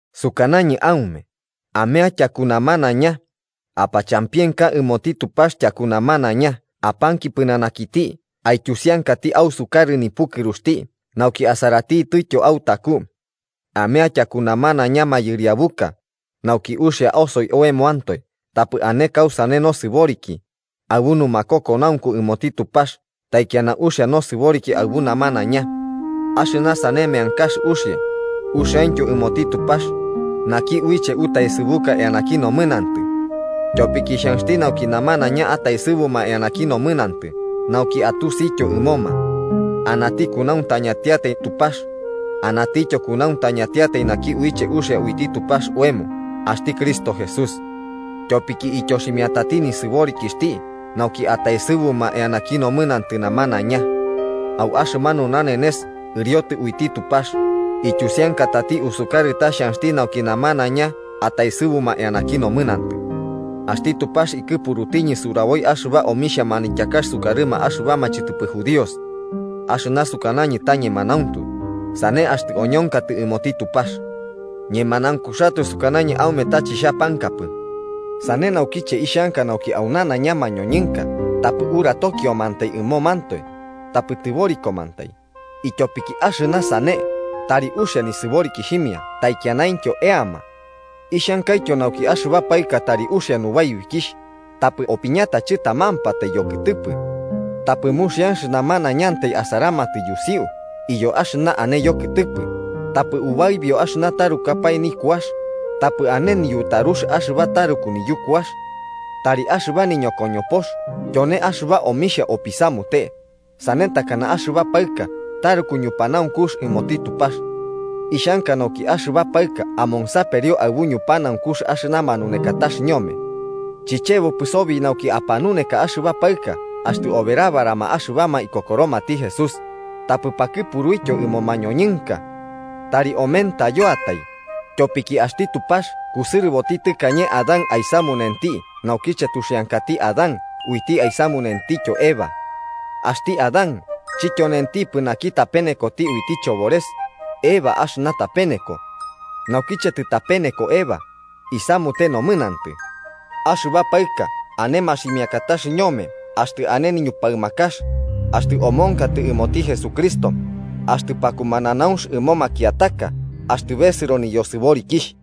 Sukanañɨ aume, amea tyaku namanaiña, apachampienka ɨmoti Tupax tyaku namanaiña apanki pɨnanakiti aityusiankati ausukarɨ nipukɨruxti nauki asaratitɨtyo autaku. Amea tyaku namanaiña mayɨriabuka, nauki uxia osoi oemoantoe tapɨ ane kausane nosɨboriki, aɨbu numakokonaunku ɨmoti Tupax taikiana uxia nosɨboriki aɨbu namanaiña. Axɨna sane meankax uxia, uxiaintyo ɨmoti Tupax, naki uiche utaesɨbuka eanaki nomɨnantɨ. Tyopiki xhanxti nauki namanaiña ataesɨbuma eanaki nomɨnantɨ nauki atusityo ɨmoma: Anati kunauntañatiatai Tupax, anatityo kunauntañatiatai naki uiche uxia uiti Tupax oemo axti Cristo Jesús. Tyopiki ityoximiatati nisɨborikixhti nauki ataesɨbuma eanaki nomɨnantɨ namanaiña. Au axɨmanu nanenes ɨriotɨ uiti Tupax, ityusiankatati usukarɨ ta xhanxti nauki namanaiña ataesɨbuma eanaki nomɨnantɨ. Axti Tupax ikɨpurutiñɨ suraboi axɨba omixhia manityakax sukarɨma axɨbama chɨtɨpɨ judíos. Axɨna sukanañɨ ta ñemanauntu, sane axtɨ oñonkatɨ ɨmoti Tupax. Ñemanaunkuxatoe sukanañɨ aume ta chixhapankapɨ. Sane naukiche ixhanka nauki au nanaiña mañoñɨnka tapɨ uratokiomantai ɨmomantoe, tapɨ tɨborikomantai, ityobo axɨna sane tari uxia nisɨborikixhimia taikianaintyo eama. Ixhankaityo nauki axɨba paɨka tari uxia nubaibikixh, tapɨ opiñata chɨtamampatai yokɨtɨpɨ. Tapɨ muxianx namanaiñantai asaramatɨ yusiu iyo axɨna ane yokɨtɨpɨ, tapɨ ubaibio axɨna tarukapae nikuax, tapɨ ane niyutarux axɨba taruku niyukuax. Tari axɨba niñokoñopox tyone axɨba omixhia opisamute, sane takana axɨba paɨka taruku ñupanaunkux ɨmoti Tupax. Ixhanka nauki axɨba paɨka amonsaperio aɨbu ñupanaunkux axɨna manunekatax ñome. Chichebopɨ sobi nauki apanuneka axɨba paɨka axtɨ oberabarama axɨbama ikokoromati Jesús, tapɨ pakɨpuruityo ɨmo mañoñɨnka. Tari omentayoatai. Tyopiki axti Tupax kusɨrɨboti tɨkañe Adán aisamunuti naukiche tuxiankati Adán uiti isamutentityo Eva. Axti Adán chityonentipɨ naki tapenekoti uiti chobores, Eva axɨna tapeneko. Naukiche tɨtapeneko Eva, isamute nomɨnantɨ. Axɨba paɨka ane maximiakatax ñome axtɨ ane niñupaɨmakax, axtɨ omonkotɨ ɨmoti Jesucristo, axtɨ pakumananaunx ɨmo makiataka axtɨ besɨro niyosɨborikixh.